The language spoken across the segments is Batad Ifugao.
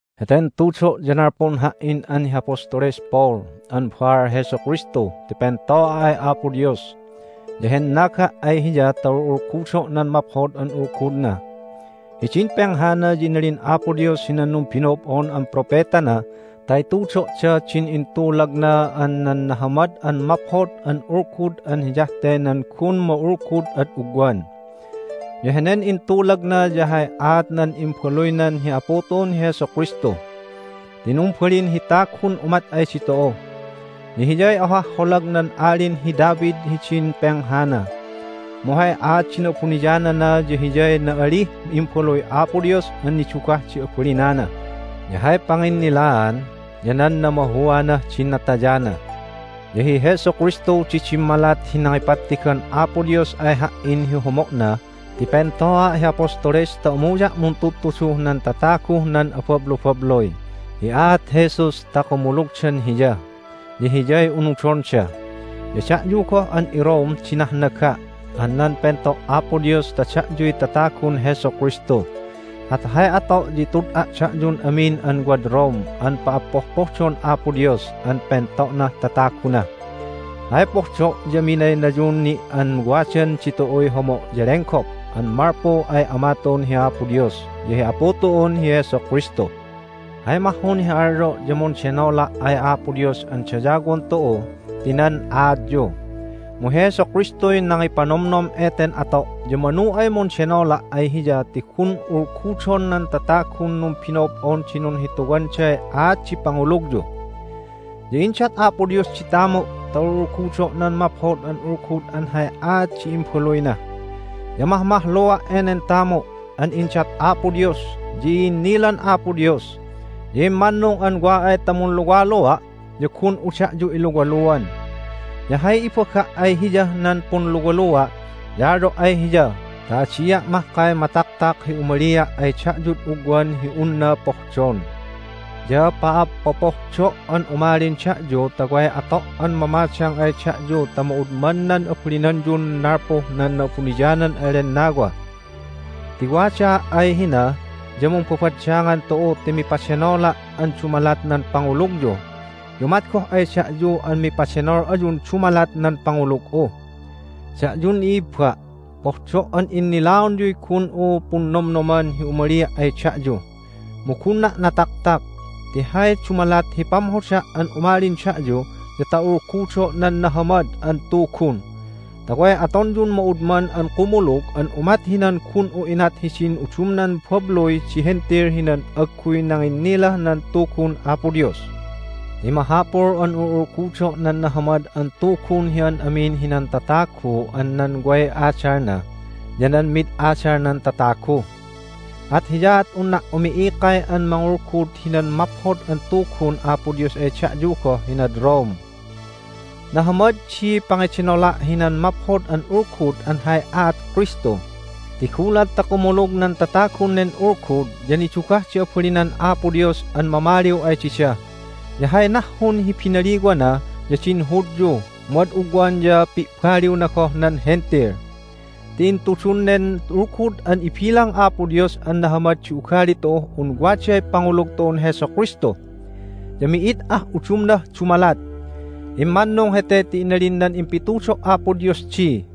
Heten tudo' ya nalpun ha"in an hi Apostoles Paul an baal Jesu Kristu ti pento'a' ay Apo Dios, ya hennaga' ay Hiya ta ul'ulgudo' nan Maphod an Ulgudna. Hidin penghana ya inalin Apo Dios hinan numbino'ob'on an propetana ta itudo'da din intulagna an nan Nahamad an Maphod an Ulgud an hiyah te nan gun ma'ulgud ad ugwan. Ya henen intulagna ya hay aat nan Imbaluynan hi Apu tu'un hi Jesu Kristu. Ti numbalin hi tagun umat ay ditu'u, ya Hiyay ohah holag nan Alin hi David hidin penghana. Mu hay aat di na'abuniyanana ya Hiyay na'alih Imbaluy Apo Dios an nidugah di abalinana, ya hay panginnilaan ya nan namahuanah din natayana. Ya hi Jesu Kristu di dimmalat hi nangipattigan Apo Dios ay ha"in hi homo'na ti pento'a' hi apostoles ta umuya' muntudtuduh nan tataguh nan abablubabluy hi aat Jesus ta kumulugdan Hiya, ya Hiyay unudonda. Ya da'yu goh an iRome di nahnaga' an nan pento' Apo Dios ta da'yuy tatagun Jesu Kristu. At hay ato' ya itud'a' da'yun amin an wad Rome an pa'appohdon Apo Dios an pento'nah tataguna. Hay pohdo' ya minaynayun ni' an wadan ditu'uy homo' ya lenggop an malpu ay Ama tu'un hi Apo Dios ya hi Apu tu'un hi Jesu Kristu. Hay mahhun hi alyo' ya mundenola' ay Apo Dios an dayawon tu'u ti nan aatyu! Mu hi Jesu Kristuy nangipanomnom eten ato', ya manu ay mundenola' ay Hiya ti gun ulgudon nan tatagun numbino'ob'on di nunhituwanday aat di pangulugyu. Ya indat Apo Dios di tamu' ta ul'ulgudo' nan Maphod an Ulgud an hay aat di Imbaluyna, ya mahmahlua' enen tamu' an indat Apo Dios. Ya i'innilan Apo Dios, ya immannung an wa ay ta munluwalua' ya gun'u da'yu iluwaluan. Ya hay ibaga' ay Hiyah nan punluwalua' ya alyo' ay Hiya ta adia' mahkay mataktak hi umalia' ay da'yud ugwan hi unna pohdon. Ya pa'appopohdo' an umalin da'yu ta way ato' an mamadang ay da'yu ta ma'udman nan abalinanyun nalpuh nan Na'abuniyanan an Lennawa. Ti wadaa' ay hina ya mumbabaddangan tu'u ti mipadenola' an dumalat nan pangulugyu, ya umat goh ay da'yu an mipadenol ayun dumalat nan pangulug'u. Da'yun i'ibba', pohdo' an innilaonyuy gun'u punnomnoman hi umalia' ay da'yu, mu gunna' nataktak. Ti hay dumalat hi pamhoda' an umalin da'yu ya ta ulgudo' nan Nahamad an Tugun, ta way atonyun ma'udman an kumulug an umat hinan gun'u inat hidin udumnan babluy di Hentil hinan agguy nanginnilah nan Tugun Apo Dios. Ti mahapul an ul'ulgudo' nan Nahamad an Tugun hi an amin hinan tatagu an nan way adalna, ya nan mid adalnan tatagu. At hiyaat unna' umi'ikay an mangulgud hinan Maphod an Tugun Apo Dios ay da'yu goh hinad Rome. Nahamad di pangedenola' hinan Maphod an Ulgud an hay aat Kristu, ti gulat ta kumulug nan tatagun nen Ulgud ya nidugah di abalinan Apo Dios an mamaliw ay dida. Ya hay nahhun hi binaliwana ya din Hudyu, mu ad ugwan ya pi'baliwna goh nan Hentil. Ti intudun nen Ulgud an ibilang Apo Dios an nahamad di ugali tu'uh un waday pangulug tu'un Jesu Kristu, ya mi'id ah udumnah dumalat. Immannung hete ti inalin nan impitudo' Apo Dios di,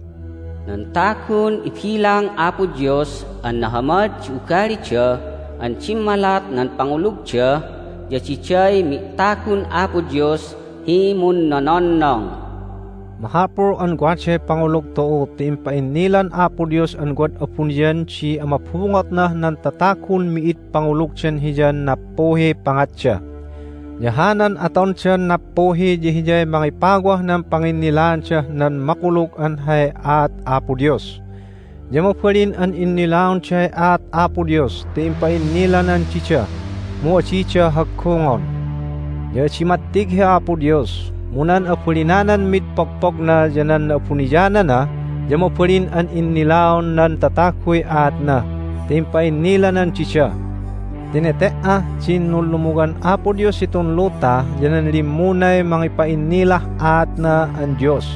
"Nan tagun ibilang Apo Dios an nahamad di ugalida an dimmalat nan pangulugda ya diday mi'tagun Apo Dios hi munnononnong." Mahapul an waday pangulug tu'u ti impa'innilan Apo Dios an wad abuniyan di amabungotnah nan tatagun mi'id pangulugdan Hiyan nappuhiy pangatda. Ya hanan atondan nappuhi ya hiyay mangipawah nan panginnilaandah nan makulug an hay aat Apo Dios. Ya mabalin an innilaonday aat Apo Dios ti impa'innilanan dida, mu adida haggungon. Ya adi mattig hi Apo Dios, mu nan abalinanan mid pogpogna ya nan na'abuniyanana, ya mabalin an innilaon nan tataguy aatna ti impa'innilanan dida. Ti nete"ah din nunlumuwan Apo Dios hitun luta ya nan limmunay mangipa'innilah aatna an Dios,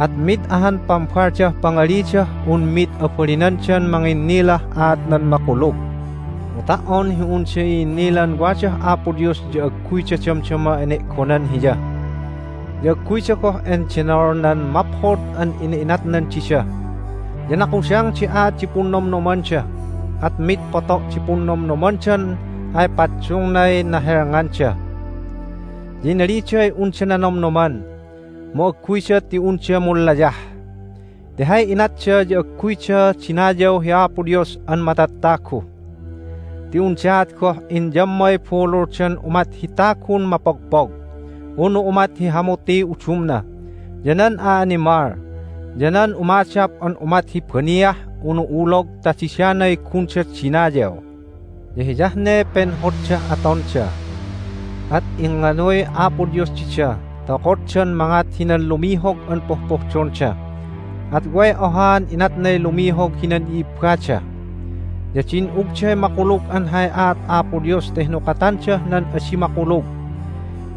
at mid ahan pambaldah pangalidah un mid abalinandan manginnilah aat nan makulug. Mu ta"on hi unda i'innilan wadah Apo Dios ya agguyda damdama ene'gonan Hiya, ya agguyda goh endenol nan maphod an ina'inatnan dida. Ya nakudang di aat di punnomnomanda, at mid poto' di punnomnomandan ay paddungnay nahelnganda. Ya inaliday unda nanomnoman, mu agguyda ti unda munlayah ti hay inatda ya agguyda dinayaw hi Apo Dios an matattagu. Ti undaat goh inyammay bululdan umat hi tagun mapogpog, unu umat hi hamutiy udumna, ya nan a'animal, ya nan umadap an umat hi baniah unu ulog ta didanay gunda dinayaw. Ya hiyah ne penhoddah atonda, at ingnganuy Apo Dios dida ta okoddan mangat hinan lumihog an pohpohdonda, at way ohaan inatnay lumihog hinan i'ibbada. Ya din'ugday makulug an hay aat Apo Dios ta hinukatandah nan adi makulug.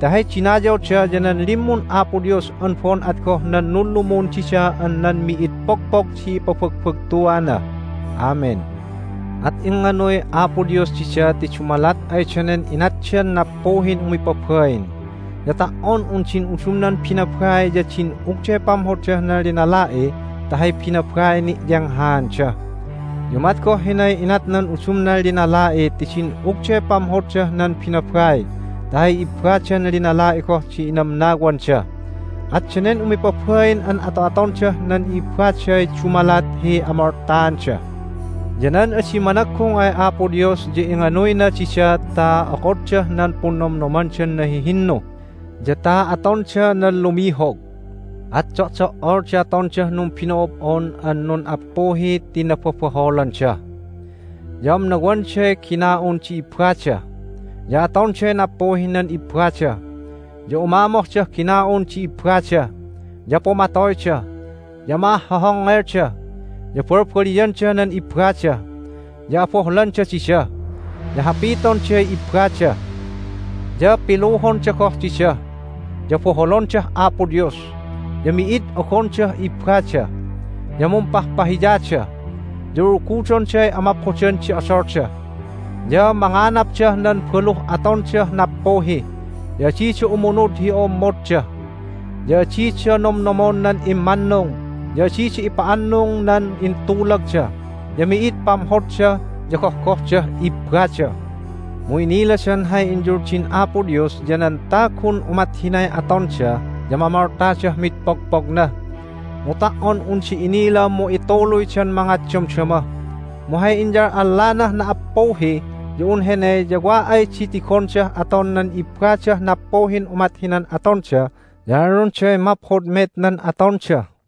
Ti hay dinayawda ya nan limmun Apo Dios an bo'on at goh nan Nunlumun dida an nan mi'id pogpog di ipabagbagtuana! Amen. At ingnganuy Apo Dios dida ti dumalat ay danen inatdan nappuhin umipabain. Ya ta"on un din udumnan binabai ya din'ugday pamhoddah nan linala'i ta hay binabaiy ni'yenghaanda. Ya umat goh hinay inat nan udumnan linala'i ti din'ugday pamhoddah nan binabai ta hay ibbadan linala'i goh di inamnawanda. At danen umipabain an ato'atondah nan i'ibbaday dumalat hi amoltaanda. Ya nan adi managgung ay Apo Dios ya inganuyna dida ta okoddah nan punnomnomandan nahihinnu, ya ta atonda nan lumihog. At do'do"ol di atondah numbino'ob'on an nun'appuhi ti nababahholanda. Ya amnawanday gina'un di ibbada, ya atonday nappuhih nan ibbada, ya umamohdah gina'un di ibbada, ya pumatoyda, ya ma'ahhohongngelda, ya balbaliyanda nan ibbada, ya abohlanda dida, ya hapitonday ibbada, ya piluhonda goh dida, ya boholondah Apo Dios, ya mi'id ogondah ibbada, ya mumpahpahiyada, ya ulgudonday amaphodan di odolda, ya manganapdah nan baluh atondah nappuhi, ya adida umunud hi o'ommodda, ya adida nomnomon nan immannung, ya adida ipa'annung nan intulagda, ya mi'id pamhodda ya gohgohdah ibbada. Mu iniladan hay inyuldin Apo Dios ya nan tagun umat hinay atonda ya mamoltadah mid pogpogna. Mu ta"on unda inila mu ituluydan mangat damdama. Mu hay inyal'allanah na"appuhi ya un hene ya wa ay di tigondah aton nan ibbadah nappuhin umat hinan atonda ya alyonday maphod met nan atonda.